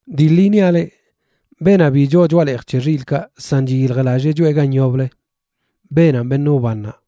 ’Dii ḻi niaꞌ leꞌ, beenaꞌ bi choo choꞌa leej c̱he xilꞌkaꞌ san chiyiljlallee choꞌe gan yoblə, beenanꞌ beṉꞌ wbannaꞌ.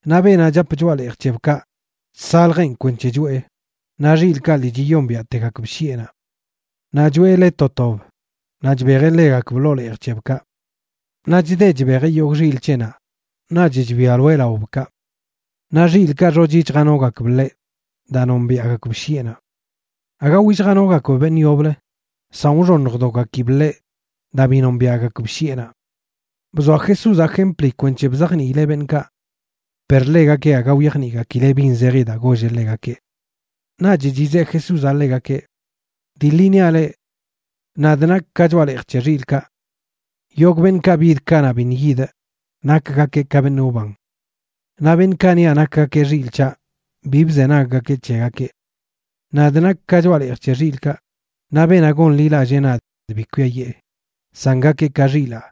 Naꞌ beenaꞌ chap choꞌa leej c̱hebkaꞌ chsaljeꞌn kwenc̱he choꞌe, naꞌ xilꞌkaꞌ lii chiyombiaꞌtegakb shiꞌenaꞌ. Naꞌ choꞌe le to tob naꞌ chbejeꞌ ḻegakb ḻoo leej c̱hebkaꞌ. Naꞌ chde chbejeꞌ yogꞌ xilꞌ c̱heꞌnaꞌ naꞌch chbialoeꞌ laobkaꞌ. Naꞌ xilꞌkaꞌ xochi chjanogakb ḻeꞌ daa nombiaꞌgakb shiꞌenaꞌ. Aga willjanogakb beṉꞌ yoblə, san wxoṉjdogakib ḻeꞌ daa bi nombiaꞌgakb shiꞌenaꞌ. Bzoa Jesúzaꞌ jempli kwenc̱he bzajniileꞌ beṉꞌkaꞌ. Per ḻegakeꞌ aga wyajniꞌgakileꞌ bin zeji daa golleꞌ ḻegakeꞌ. Naꞌch chizeꞌ Jesúzaꞌ ḻegakeꞌ: ―Dii ḻi niaꞌ leꞌ: Nadꞌ nakꞌ ka choꞌa leej c̱he xilꞌkaꞌ. Yogꞌ beṉꞌkaꞌ bid kanaꞌ biṉꞌ yidꞌ, nakgakeꞌ ka beṉꞌ wban. Naꞌ beṉꞌkaꞌ niaꞌ nakgakeꞌ xilꞌ c̱haꞌ bi bzenaggakeꞌ c̱hegakeꞌ. Nadꞌ nakꞌ ka choꞌa leej c̱he xilꞌkaꞌ, naꞌ beenaꞌ gonḻilallee nadꞌ bi kwiayee, san gakeꞌ ka xilaa,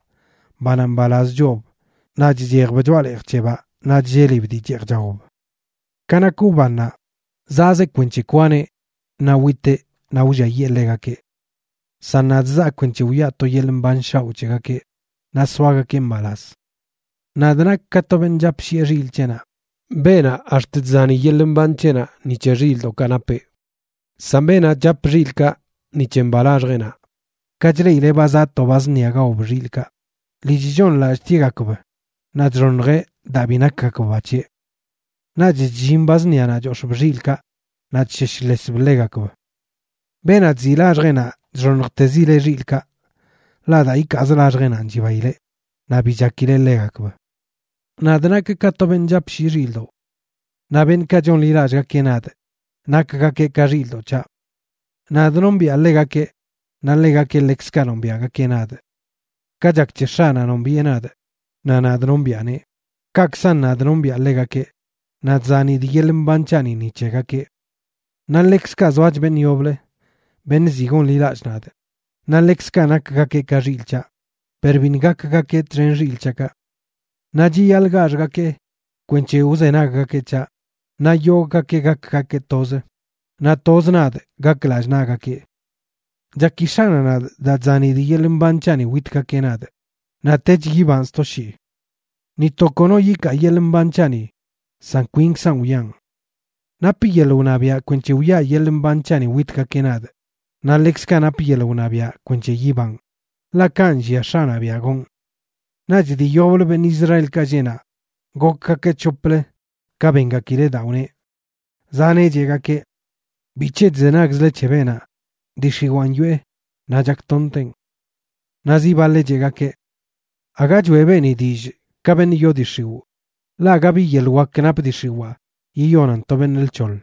banaꞌ mbalaz choob naꞌ chchejb choꞌa leej c̱hebaꞌ naꞌ chllelib dii cheej chaob. ’Ka nak wbannaꞌ, zaꞌzeꞌ kwenc̱he kwaneꞌ naꞌ witeꞌ naꞌ wlliayee ḻegakeꞌ. San nadꞌ, zaa kwenc̱he wiꞌa to yeḻꞌ mban shaoꞌ c̱hegakeꞌ, naꞌ soagakeꞌ mbalaz. Nadꞌ nakꞌ ka to beṉꞌ chapshiꞌe xilꞌ c̱heꞌnaꞌ, beenaꞌ ax̱t chzani yeḻꞌ mban c̱heꞌnaꞌ ni c̱he xilꞌdoꞌkaꞌ napeꞌ. San beenaꞌ chap xilꞌkaꞌ ni c̱he mba laxjeꞌnaꞌ, ka chleꞌileꞌ ba zaꞌ to ba zṉia gaob xilꞌkaꞌ, lii chchooṉlallꞌtieꞌgakb naꞌ chxoṉjeꞌ daa bi nakgakb ba c̱heꞌ. Naꞌch chllin ba zṉianaꞌ chox̱ꞌb xilꞌkaꞌ naꞌ chsheshlesb ḻegakb. Beenaꞌ chziꞌ laxjeꞌnaꞌ chxoṉjtezileꞌ xilꞌkaꞌ, ḻaꞌ daa ikaaz laxjeꞌnanꞌ chibaileꞌ, naꞌ bi chakileꞌ ḻegakb. ’Nadꞌ nakꞌ ka to beṉꞌ chapshiꞌ xilꞌdoꞌ. Naꞌ beṉꞌkaꞌ chonḻilallꞌgakeꞌ nadꞌ nakgakeꞌ ka xilꞌdoꞌ c̱haꞌ. Nadꞌ nombiꞌa ḻegakeꞌ naꞌ ḻegakeꞌ ḻekzkaꞌ nombiaꞌgakeꞌ nadꞌ. Ka chak c̱he X̱aꞌnaꞌ nombiꞌe nadꞌ, naꞌ nadꞌ nombiꞌaneꞌ, kaꞌkzan nadꞌ nombiꞌa ḻegakeꞌ, naꞌ chzanidꞌ yeḻꞌ mban c̱haꞌni ni c̱hegakeꞌ. Naꞌ ḻekzkaꞌ zoach beṉꞌ yoblə, beṉꞌ ziꞌ gonḻilallꞌ nadꞌ, naꞌ ḻekzkaꞌ nakgakeꞌ ka xilꞌ c̱haꞌ, per biṉꞌ gakgakeꞌ txen xilꞌ c̱haꞌkaꞌ. Naꞌ chiyaḻꞌ gaxgakee kwenc̱he wzenaggakeꞌ c̱haꞌ, naꞌ yogꞌgakeꞌ gakgakeꞌ tozə, naꞌ toz nadꞌ gak lallꞌ naꞌgakeꞌ. ’Chaki X̱aꞌnaꞌ nadꞌ daa chzanidꞌ yeḻꞌ mban c̱haꞌni witgakeꞌ nadꞌ, naꞌtech yibanꞌ sto shii. Ni to kono yikaa yeḻꞌ mban c̱haꞌni, san kwinkzaꞌn wiꞌan. Napꞌ yeḻꞌ wṉabiaꞌ kwenc̱he wiꞌa yeḻꞌ mban c̱haꞌni witgakeꞌ nadꞌ, naꞌ ḻekzkaꞌ napꞌ yeḻꞌ wṉabiaꞌ kwenc̱he yibanꞌ. Ḻaꞌ kanꞌ nllia X̱aꞌnaꞌ biaꞌ gonꞌ. Naꞌch dii yoblə beṉꞌ Israelkaꞌ lleꞌ naꞌ gokgakeꞌ c̱hoplə ka bengakileꞌ daa wneꞌ. Zaneꞌ cheꞌgakeꞌ: ―¿Bic̱he chzenagzle c̱he beenaꞌ? Dii x̱iwaan yoꞌe, naꞌ chaktonteꞌn. Naꞌ zi baḻeꞌ cheꞌgakeꞌ: ―Aga choeꞌ beeni dillꞌ ka beṉꞌ yoo dii x̱iwꞌ, ḻaꞌ aga bi yeḻꞌ wak nap dii x̱iwaa yiyonan to beṉꞌ lc̱hoḻ.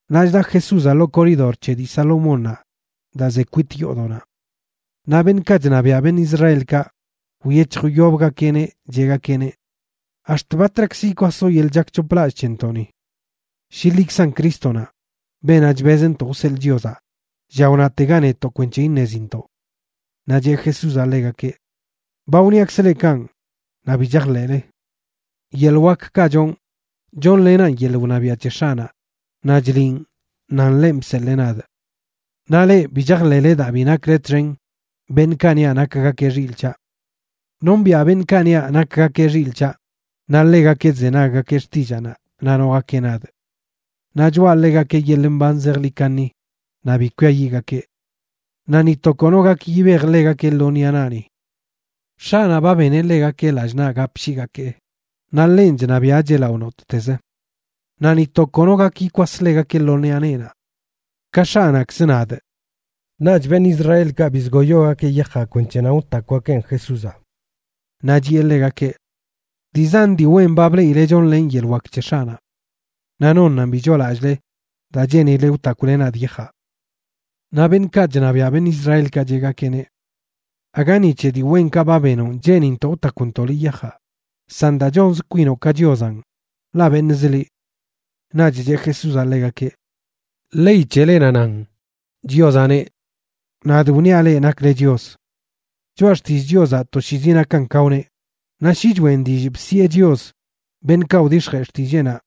Naꞌ chda Jesúzaꞌ ḻoo koridor c̱he dii Salomónnaꞌ daa ze kwit yoodoꞌnaꞌ. Naꞌ beṉꞌkaꞌ chṉabiaꞌ beṉꞌ Israelkaꞌ wyec̱hjyobgakeꞌneꞌ, cheꞌgakeꞌneꞌ: ―¿Ax̱t batrakzə yikwasoꞌ yeḻꞌ chakc̱hoplallꞌ c̱hentoꞌni? Shi liꞌkzan Crístonaꞌ, beenaꞌ chbezntoꞌ wseḻꞌ Chiozaꞌ, lla wnatega netoꞌ kwenc̱he iṉezintoꞌ. Naꞌ cheꞌ Jesúzaꞌ ḻegakeꞌ: ―Ba wniakzꞌ leꞌ kanꞌ, naꞌ bi chajḻeꞌle. Yeḻꞌ wakkaꞌ chonꞌ, chonlenaꞌn yeḻꞌ wṉabiaꞌ c̱he X̱aꞌnaꞌ, naꞌ chliꞌn nan ḻenꞌ bseḻee nadꞌ. Naꞌ leꞌ, bi chajḻeꞌle daa bi nakle txen beṉꞌkaꞌ niaꞌ nakgakeꞌ xilꞌ c̱haꞌ. Nombiꞌa beṉꞌkaꞌ niaꞌ nakgakeꞌ xilꞌ c̱haꞌ, naꞌ ḻegakeꞌ chzenaggakeꞌ xtillaanaꞌ naꞌ nogakeꞌ nadꞌ. Naꞌ choꞌa ḻegakeꞌ yeḻꞌ mban zejḻi kaṉi, naꞌ bi kwiayiꞌgakeꞌ. Naꞌ ni to kono gak yibej ḻegakeꞌ lo ṉiꞌa naꞌni. X̱aꞌnaꞌ ba beneꞌ ḻegakeꞌ lallꞌ naꞌ gapshiigakee, naꞌ ḻenꞌ chṉabiaꞌcheꞌ lao nottez. Naꞌ ni to kono gak yikwas ḻegakeꞌ lo ṉiꞌa neenaꞌ. Ka X̱aꞌnaꞌkz, nadꞌ. Naꞌch beṉꞌ Israelkaꞌ bizgoyogakeꞌ yajaꞌ kwenc̱he nan wtakwgakeꞌn Jesúzaꞌ. Naꞌ chiꞌe ḻegakeꞌ: ―Dii zan dii wen ba bleꞌile chonlenꞌ yeḻꞌ wak c̱he X̱aꞌnaꞌ. Naꞌ ¿nonnanꞌ bi choolallꞌle daa cheenileꞌ wtakwle nadꞌ yajaꞌ? Naꞌ beṉꞌkaꞌ chṉabiaꞌ beṉꞌ Israelkaꞌ cheꞌgakeꞌneꞌ: ―Aga ni c̱he dii wenkaꞌ ba benonꞌ cheenintoꞌ wtakwntoꞌ liꞌ yajaꞌ, san daa chonz kwinoꞌ ka Chiozanꞌ, ḻaꞌ beṉꞌzə liꞌ. Naꞌch cheꞌ Jesúzaꞌ ḻegakeꞌ: ―Ley c̱helenaꞌ nan, Chiozaꞌ neꞌ: “Nadꞌ wniaꞌ leꞌ nakle chios.” Choꞌa Xtillꞌ Chiozaꞌ toshiizi nakan ka wneꞌ, naꞌ shi choꞌen dillꞌ bsiꞌe “chios” beṉꞌkaꞌ wdix̱jee xtilleenaꞌ,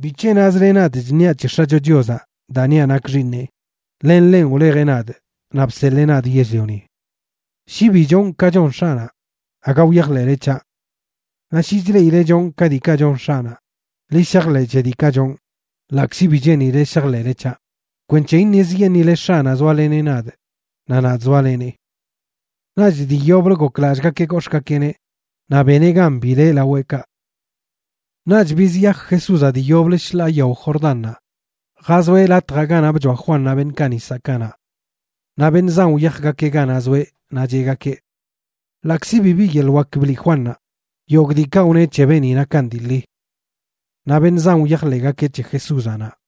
¿bic̱he nazle nadꞌ chṉiaꞌ c̱he X̱acho Chiozaꞌ daa niaꞌ nakꞌ Xiiṉeꞌ, len ḻenꞌ wlejeꞌ nadꞌ naꞌ bseḻee nadꞌ yell-lioni? Shi bi chonꞌ ka chon X̱aꞌnaꞌ, aga wyajḻeꞌle c̱haꞌ. Naꞌ shi chleꞌile chonꞌ ka diikaꞌ chon X̱aꞌnaꞌ, ḻi shajḻeꞌ c̱he diikaꞌ chonꞌ, ḻaꞌkzi bi cheenile shajḻeꞌle c̱haꞌ, kwenc̱he iṉezyeṉꞌile X̱aꞌnaꞌ zoaleneꞌ nadꞌ naꞌ nadꞌ zoalenee. Naꞌch dii yoblə goklallꞌgakeꞌ gox̱ꞌgakeꞌneꞌ naꞌ beneꞌ gan bileꞌ laweꞌkaꞌ. Naꞌch bizyaj Jesúzaꞌ dii yoblə shḻaa yao Jordánnaꞌ jazoeꞌ latjaꞌ ganaꞌ bchoa Juannaꞌ beṉꞌkaꞌ nisaꞌ kanaꞌ. Naꞌ beṉꞌ zan wyajgakeꞌ ganaꞌ zoeꞌ naꞌ cheꞌgakeꞌ: ―Ḻaꞌkzi bibi yeḻꞌ wak bliꞌ Juannaꞌ, yogꞌ diikaꞌ wneꞌ c̱he beeni nakan dii ḻi. Naꞌ beṉꞌ zan wyajleꞌgakeꞌ c̱he Jesúzaꞌ naꞌ.